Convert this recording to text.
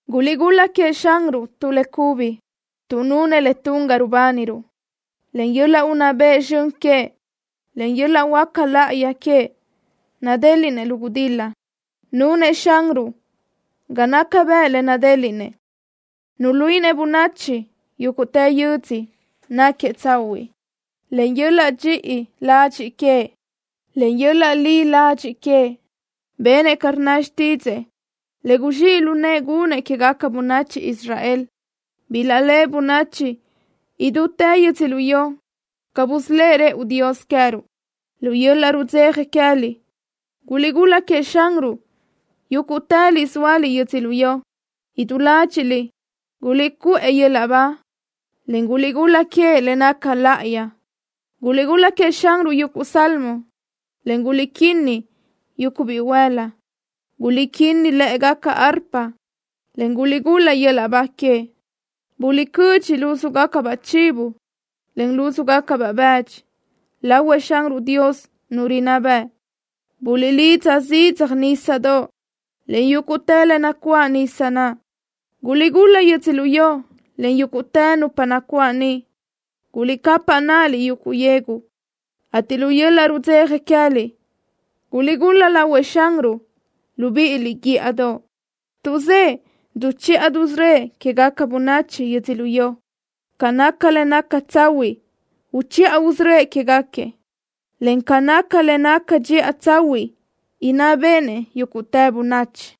¡Guliʼgul-la queëʼ Xanruʼ tu le cubi, tuʼ nunëʼ le tun ga rubániruʼ! Len yöl-laʼ unná bëʼ zxön queëʼ, en yöl-laʼ huáca láʼayi queëʼ nadéliʼnëʼ lu gudil-la. Nunëʼ Xanruʼ ga naca bëʼ le nadéliʼnëʼ. Nuluíʼinëʼ bönachi yúguʼtë yödzö náquiëʼ tsahuiʼ. Len yöl-laʼ dxiʼi ladxiʼ queëʼ, en yöl-laʼ li ladxiʼ queëʼ benëʼ ca rnna xtídzëʼë le guzxíʼ lu nëʼë gunëʼ quégaca bönachi Israel. Bilaʼléʼe bönachi idútë yödzölió ca busölë́ʼ rëʼu Dios queë́ruʼ. ¡Lu yöl-laʼ rudzeja queë́liʼ guliʼgul-la queëʼ Xanruʼ, yúguʼtëliʼ zóaliʼ yödzölió! ¡Idú ládxiʼliʼ guliʼcuʼë yöl-laʼ ba, en guliʼgul-la queëʼ le naca láʼayi! ¡Guliʼgul-la queëʼ Xanruʼ yuguʼ salmo, en guliʼquinnaj yuguʼ bihuël-la! ¡Guliʼquinnaj lë́ʼegaca arpa, en guliʼgul-la yöl-laʼ ba queëʼ! ¡Guliʼcödxi lúzugacabaʼ chivo, en lúzugacabaʼ bëdxi lahuëʼ Xanruʼ Dios, Nu rinná bëʼ! ¡Buliʼlidza zidzaj, nísadoʼ, en yúguʼtë le nacuáʼ nisa naʼ! ¡Guliʼgul-la yödzölió, en yúguʼtë nupa nacuáʼ niʼ! ¡Guliʼcapaʼ náʼaliʼ, yuguʼ yegu, ateʼ lu yöl-laʼ rudzeja queë́liʼ guliʼgul-la lahuëʼ Xanruʼ, libíʼiliʼ, guíʼadoʼ, tuʼ zëʼë duchiʼa dusörö́ëʼ quégaca bönachi yödzölió! Ca naca le naca tsahuiʼ uchiʼa usörö́ëʼ quéguequi, en ca naca le naca dxiʼa tsahuiʼ inná béʼenëʼ yúguʼtë bönachi.